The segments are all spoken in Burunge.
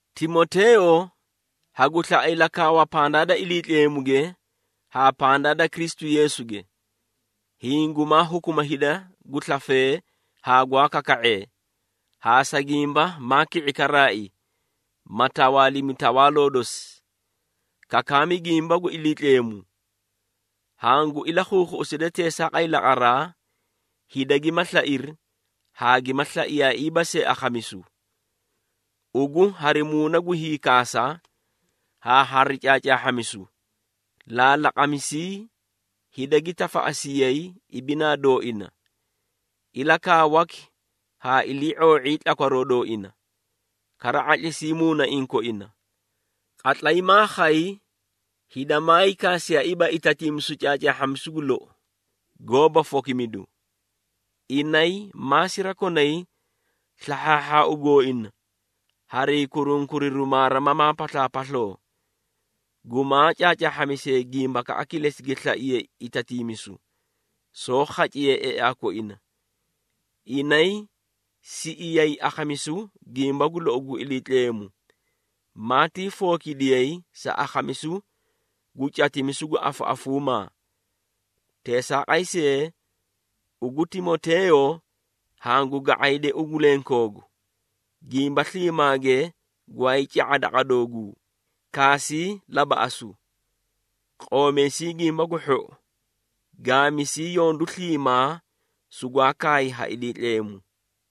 Timoteeyo, hagu slaꞌa ilakaawa pandaa da Iliitleemuge haa pandaa da Kristu Yeesuge, hiĩ gumaa hukuma hida gu slafee haa gwaa kaka⁄ee, haa sa gimba maa ki⁄i karaai, ma tawaalimi tawaaloo dosi: kakaami gimba gu Iliitleemu! Hangu ilakhuukhuꞌuside teesaaqay laqaraa, hida gima slairi haa gima slaiyaaiiba see akhamisu. Ugu hari muuna gu hiikaasa haa hari caacaahhamisu, laalaqamisii hida gi tafaꞌasiyay ibinaa dooina, ilakaawaki haa ilii⁄oo⁄ii tlakwaroo dooina, kara ⁄atlisii muunaiĩ koina. Qatlay maa khay, hida maayii kaasiyaaiiba itatiimisu caacaahhamisu gu lou, goóba fokimidu. Inay ma sirakonay slahhaahhaau gooina harii kurunkuriru maarimamaa paslaapasloo, gumaa caacaahhamisee gimbakaꞌa kilesi gi slaiyee itatiimisu, soó khaciye eaa koina. Inay siꞌiyay akhamisu gimba gu lou gu Iliitleemu, maatii fookidiyay sa akhamisu gu catimisu gu afuafuumaa. Teesaaqay see ugu Timoteeyo, hangu ga⁄ayde ugu lenkoogu, gimba sliimaage gwaayii ca⁄a daqa dooguu, kaasii labaꞌasu, qoomeesii Gimba gu Hhou, gaamisii yondu sliimaa sugwaa kaay ha Iliitleemu.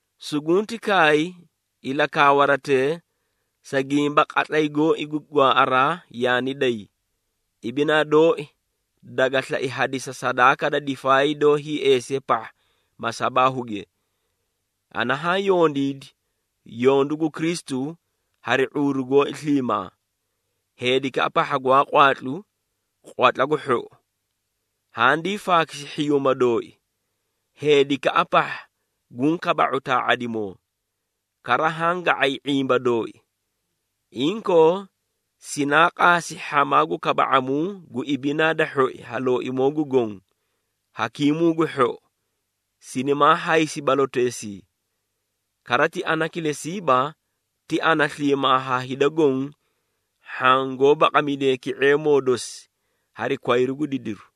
Sugunti kaay ilakaawaratee, sa gimba qatlay gooi gu gwaaꞌaraa yaani day. Ibinaa dooi daga slai hadisa sadaaka da difaay doó hiieesiye pahha masabaahuge. Ana haã yondiidi yondu gu Kristu hari ⁄uuru gooi sliimaa, heedikaꞌa pahha gwaa qwaatlu, qwatla gu hhou, handii faakisi hhiyuuma dooi, heedikaꞌa pahha guũ kaba⁄u taa⁄adimoo, kara haã ga⁄ay ⁄imba dooi. Inkoo sinaa qaasi hhamaa gu kaba⁄amuu gu ibinaa da hhoi ha Looimoo gu Goõ, Hakiimuu gu hhou, sinimaa haysi baloteesii. Kara ti ana kilesiiba, ti ana sliimaa haa hida goõ hhaã goó baqamidee ki⁄eemoo dosi hari kwayru gu didiru.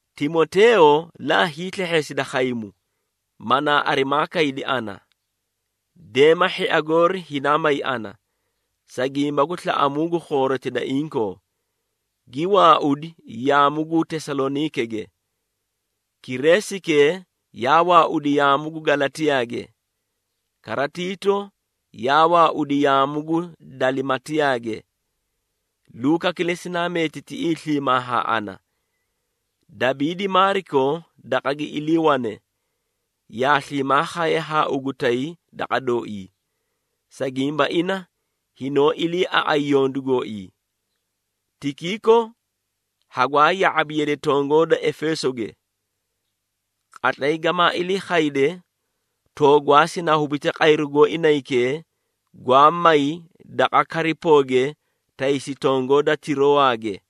Timoteeyo, laa hiislehheesida khaymu, manaa arimaa kaydi ana. Deema hhia goori hinaa may ana, sa gimba gu slaꞌamuu gu khooroti da inkoo, gi waaudi yaamu gu Tesaloniikege. Kreesike yaa waaudi yaamu gu Galatiyaage, kara Tiito yaa waaudi yaamu gu Dalimaatiyage. Luuka kilesi naa meeti tiꞌii sliimaa haa ana. Dabiidi Maariko daqa gi iliiwane, yaa sliimaa khaye haa ugu tay daqa dooii, sa gimba ina hinoó iliiaꞌay yondu gooii. Tikiiko hagwaa ya⁄abi yade tongoo da Efeesoge. Qatlay gamaa ilii khayde, toogwaa sinaa hubite qayru gooii naykee gwaa may daqa Karipooge taysi tongoo da Tiroowage.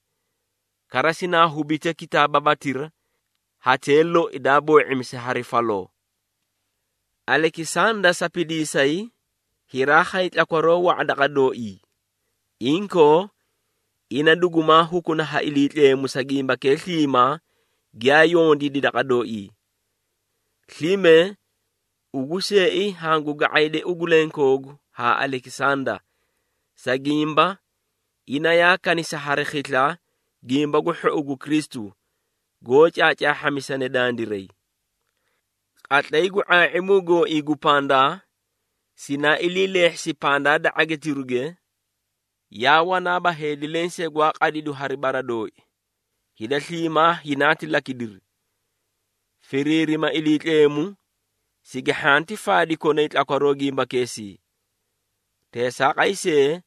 Kara sinaa hubite kitaababatira, hatee loi daa boo⁄imisi hari faloo. Alekisanda sapidiisay, hiraa khay tlakwaroo wa⁄a daqa dooii. Inkoo ina dugumaa hukuna ha Iliitleemu sa gimbakee sliimaa giyaa yondiidi daqa dooii. Slime ugu seei hangu ga⁄ayde ugu lenkoogu haa Alekisanda, sa gimba ina yaa kanisi hari khisla Gimba gu Hhou gu Kristu goó caacaahhamisane dandiray. Qatlay gu ⁄aa⁄imu gooii gu pandaa, sinaa ilii leehhisi pandaa da ⁄agitiruge, yaa wanaaba heedi lensee gwaa qadidu hari bara dooi, hida sliimaa hinaati lakidiri. Firiirima Iliitleemu, sigi hhanti faadi konay tlakwaroo gimbakeesii. Teesaaqay see,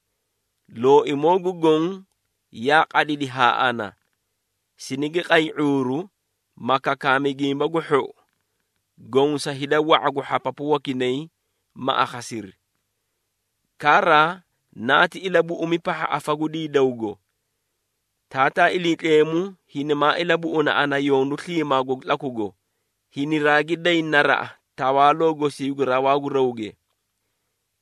Looimoo gu Goõ yaa qadidi haa ana, sinigi qay ⁄uuru, ma kakaami Gimba gu Hhou goõ sa hida wa⁄a gu hhapapu wakinay, ma akhasiri. Kara naati ilabuꞌumi pahha afa gu diidawgo. Taataa Iliitleemu hinimaa ilabuꞌuna ana yondu sliimaago gu tlakugo, hiniraagi day naraꞌa tawaaloo gosii gu rawaa gu rawge.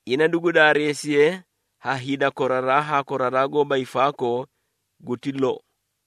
Ina dugu daareesiye ha hida koraraa haa koraraa goóba hiifaakoo! Guti lou.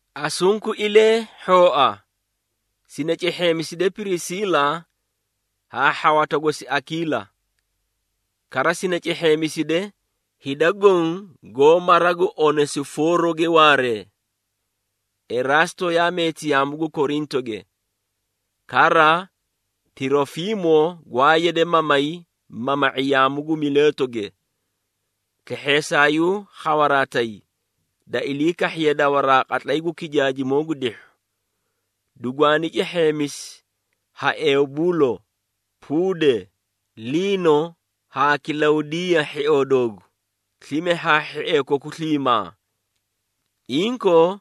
Asunkuilee hhooa sini cehheemiside Pirisiila haa hhawata gosi Akiila. Kara sini cehheemiside, hida goõ goó mara gu Onesifooroge waaree. Eraasto yaa meeti yaamu gu Korintoge. Kara Tirofiimo gwaa yade mamay mama⁄i yaamu gu Mileetoge. Slehheesaayuu khawaraa tay, da ilii kahhiye dawaraa qatlay gu kijaajimoo gu dihhu. Dugwaani cehheemisi ha Eubuulo, Puude, Linoo haa Kilaudiiya hhioo doogu, slime haa hhiee koku sliimaa. Inkoo,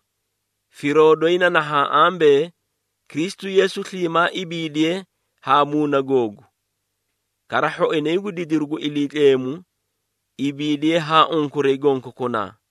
firoo doyi na nahaã ambee, Kristu Yeesu sliimaa ibiidiye haa muuna googu. Kara hhoinay gu didiru gu Iliitleemu ibiidiye haa unkuray gonkokunaa.